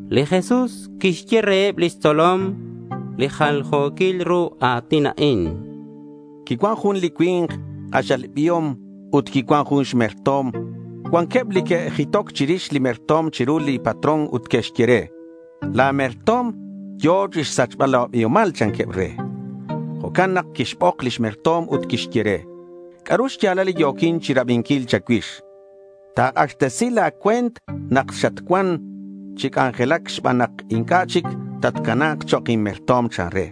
Li Jesús quixye reheb lix tzolom li jaljo̱quil ru a̱tin a'in: Quicuan jun li cui̱nk k'axal biom ut quicuan jun xmerto̱m. Cuanqueb li que'jitoc chirix li merto̱m chiru li patrón ut que'xye re: —La̱ merto̱m yo̱ chixsachbal la̱ biomal, chanqueb re. Jo'can nak quixbok lix merto̱m ut quixye re: —¿C'a'ru xya̱lal li yo̱quin chirabinquil cha̱cuix? Ta̱k'axtesi la̱ cue̱nt nak xatcuan chi c'anjelac xban nak inc'a' chic tatcana̱k chok' inmerto̱m, chan re.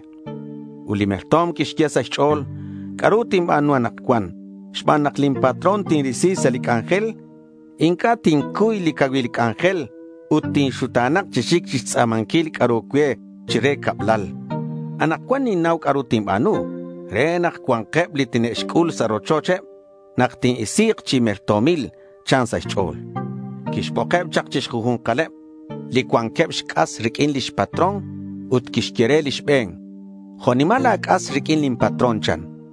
Ut li merto̱m quixye sa' xch'o̱l: —¿C'a'ru tinba̱nu anakcuan xban nak lin patrón tinrisi sa' lin c'anjel? Inc'a' tincuy li cacuil c'anjel ut tinxuta̱na̱k chi xic chixtz'a̱manquil c'a'ru cue chire cablal. Anakcuan ninnau c'a'ru tinba̱nu re nak cua̱nkeb li tine'xc'ul sa' rochocheb nak tin-isi̱k chi merto̱mil, chan sa' xch'o̱l. Quixbokeb chak chi xju̱nkaleb li cuanqueb xc'as riq'uin lix patrón. Ut quixye re li xbe̱n: —¿Jo' nimal la̱ c'as riq'uin lin patrón? chan.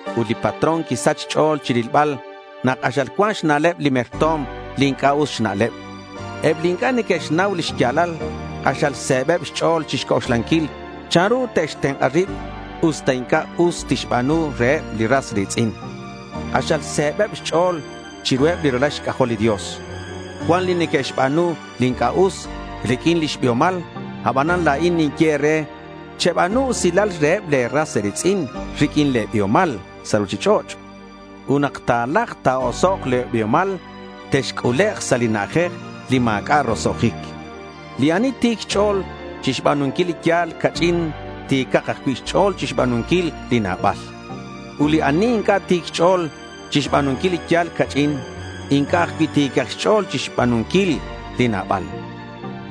Ut li patrón quisach xch'o̱l chirilbal nak k'axal cuan xna'leb li merto̱m li inc'a' us xna'leb. Eb li inc'a' neque'xnau li xya̱lal k'axal se̱beb xch'o̱l chixc'oxlanquil chanru tixtenk'a rib, usta inc'a' us tixba̱nu reheb li ras ri̱tz'in. K'axal se̱beb xch'o̱l chiruheb li ralal xc'ajol li Dios. Cuan li neque'xba̱nu li inc'a' us riq'uin lix biomal. Abanan, la̱in ninye e̱re, cheba̱nu usilal reheb le̱ ras e̱ri̱tz'in riq'uin le̱ biomal sa' ruchich'och'. Ut nak ta̱lajk ta̱osok' le̱ biomal, texc'ulek' sa' li na'ajej li ma̱c'a' roso'jic. Li ani ti̱c xch'o̱l chixba̱nunquil li yal ca'ch'in, ti̱cak ajcui' xch'o̱l chixba̱nunquil li nabal. Ut li ani inc'a' ti̱c xch'o̱l chixba̱nunquil li yal ca'ch'in, inc'a' ajcui' ti̱cak xch'o̱l chixba̱nunquil li nabal.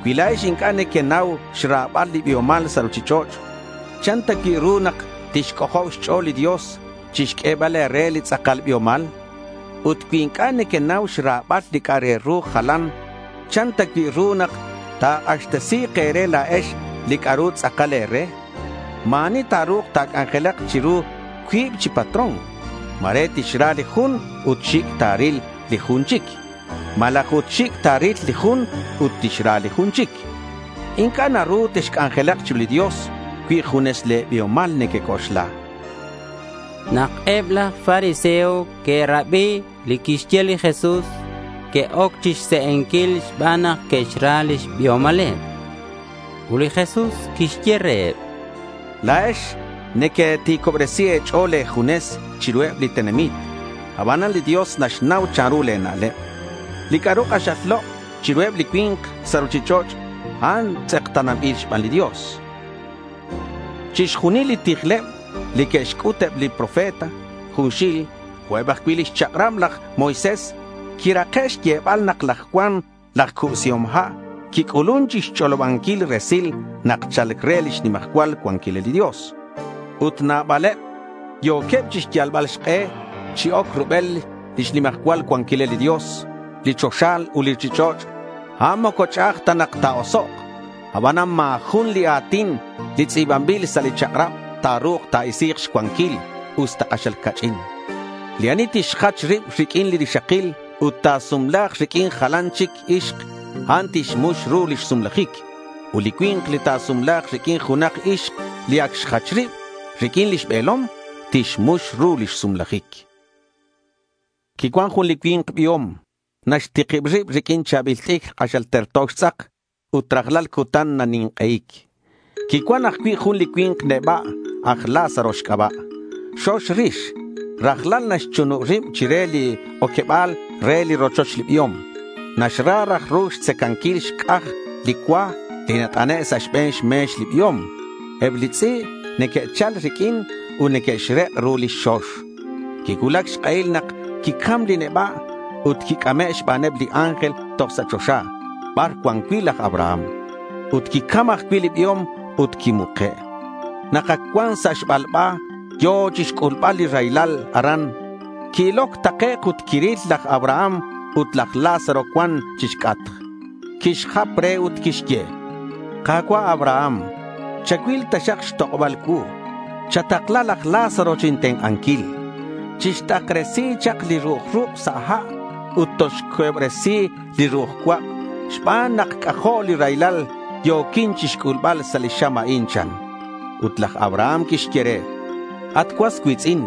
Cui la̱ex inc'a' nequenau xra̱bal li biomal sa' ruchich'och', ¿chan ta cui' ru nak tixc'ojob xch'o̱l li Dios chixq'uebal e̱re li tz'akal biomal? Ut cui inc'a' nequenau xra̱bal li c'a'ru re jalan, ¿chan ta cui' ru nak ta̱k'axtesi̱k e̱re la̱ex li c'a'ru tz'akal e̱re? Ma̱ ani ta̱ru̱k ta̱c'anjelak chiru cuib chi patrón. Ma̱re tixra li jun ut xic' ta̱ril li jun chic, malaj ut xic' ta̱ril li jun ut tixra li jun chic. Inc'a' naru texc'anjelak chiru li Dios cui junes le̱ biomal nequec'oxla. Nak eb laj fariseo que'rabi li quixye li Jesús, que'oc chixse'enquil xban nak neque'xra lix biomaleb. Ut li Jesús quixye reheb: —La̱ex nequeti̱cobresi e̱ch'o̱l e̱junes chiruheb li tenamit. Abanan li Dios naxnau chanru le̱ na'leb. Li c'a'ru k'axal lok' chiruheb li cui̱nk sa' ruchich'och', a'an tz'ekta̱nanbil xban li Dios. Chixjunil li tijleb li que'xc'ut eb li profeta junxil, jo' ajcui' lix chak'rab laj Moisés, quirake' xyebal nak laj Juan laj Cubsihom Ha' quic'ulun chixch'olobanquil resil nak cha̱lc re lix nimajcual cuanquilal li Dios. Ut nabaleb yo̱queb chixyalbal xk'e chi oc rubel lix nimajcual cuanquilal li Dios. Li choxa ut li ruchich'och', a'an moco ch'a'aj ta nak ta̱osok'. Abanan ma̱ jun li a̱tin li tz'i̱banbil sa' li chak'rab, ta̱ru̱k ta̱isi̱k xcuanquil, usta k'axal ca'ch'in. Li ani tixjach rib riq'uin li rixakil ut ta̱sumla̱k riq'uin jalan chic ixk, a'an tixmux ru lix sumlajic. Ut li cui̱nk li ta̱sumla̱k riq'uin junak ixk li ac xjach rib riq'uin lix be̱lom, tixmux ru lix sumlajic. Quicuan jun li cui̱nk biom. Naxtikib rib riq'uin cha̱bil t'icr k'axal terto xtz'ak ut rajlal cutan nanink'ei̱c. Quicuan ajcui' jun li cui̱nk neba' aj Lázaro xc'aba'. Xox rix. Rajlal naxchunub rib chire li oqueba̱l re li rochoch li biom. Naxra raj ru xtzacanquil xc'aj li cua li nat'ane' sa' xbe̱n xme̱x li biom. Eb li tz'i' neque'chal riq'uin ut neque'xrek' ru lix xox. Quicuulac xk'ehil nak quicam li neba' ut quic'ame' xbaneb li ángel toj sa' choxa bar cuan cui' laj Abraham. Ut quicam ajcui' li biom ut quimuke'. Nak ac cuan sa' xbalba, yo̱ chixc'ulbal li raylal aran. Qui-iloc takec' ut quiril laj Abraham ut laj Lázaro cuan chixc'atk. Quixjap re ut quixye: —Ka̱cua' Abraham, chacuil taxak xtok'oba̱l cuu. Chatakla laj Lázaro chintenk'anquil. Chixt'akresi chak li ru'uj ruk' sa' ha' ut tolxquehobresi li ru'uj cuak' xban nak c'ajo' li raylal yo̱quin chixc'ulbal sa' li xam a'in, chan. Ut laj Abraham quixye re: —At cuas cui̱tz'in,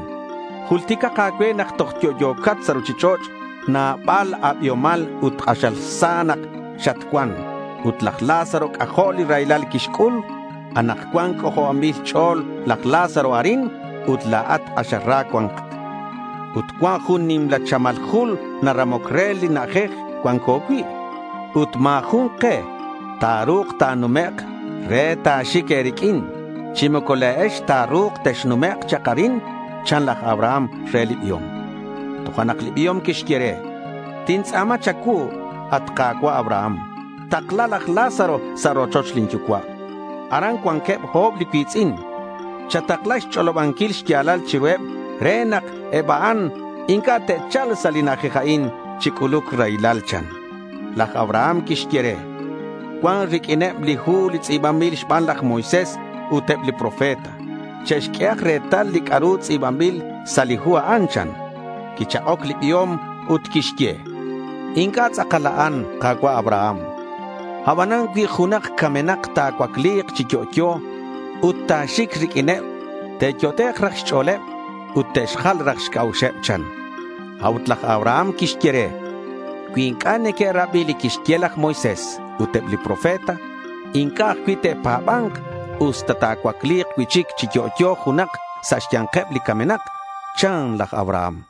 julticak a̱cue nak toj yo'yo̱cat sa' ruchich'och' nabal a̱biomal ut k'axal sa nak xatcuan. Ut laj Lázaro c'ajo' li raylal quixc'ul. Anakcuan c'ojobanbil xch'o̱l laj Lázaro arin ut la̱at k'axal ra cuancat. Ut cuan jun nimla chamal jul naramoc re li na'ajej cuanco cui'. Ut ma̱ jun ke ta̱ru̱k ta̱numek' re ta̱xic e̱riq'uin, chi moco la̱ex ta̱ru̱k texnumek' chak arin, chan laj Abraham re li biom. Tojo'nak li biom quixye re: —Tintz'a̱ma cha̱cuu, at Ka̱cua' Abraham, takla laj Lázaro sa' rochoch lin yucua'. Aran cuanqueb o̱b li cui̱tz'in. Chatakla xch'olobanquil xya̱lal chiruheb re nak eb a'an inc'a' te'cha̱lk sa' li na'ajej a'in chi c'uluc raylal, chan. Laj Abraham quixye re: —Cuan riq'uineb li hu li tz'i̱banbil xban laj Moisés, ut eb li profeta. Che'xq'uehak retal li c'a'ru tz'i̱banbil sa' li hu a'an, chan. Quichak'oc li biom ut quixye: —Inc'a' tz'akal a'an, Ka̱cua' Abraham. Abanan cui junak camenak ta̱cuacli̱k cui'chic chi yo'yo ut ta̱xic riq'uineb, te'yot'ek' raj xch'o̱l ut te'xjal raj xc'a'uxeb, chan. A'ut laj Abraham quixye re: —Cui inc'a' neque'rabi li quixye laj Moisés ut eb li profeta, inc'a' ajcui' te'pa̱ba̱nk usta ta̱cuacli̱k cui'chic chi yo'yo junak sa' xya̱nkeb li camenak, chan laj Abraham.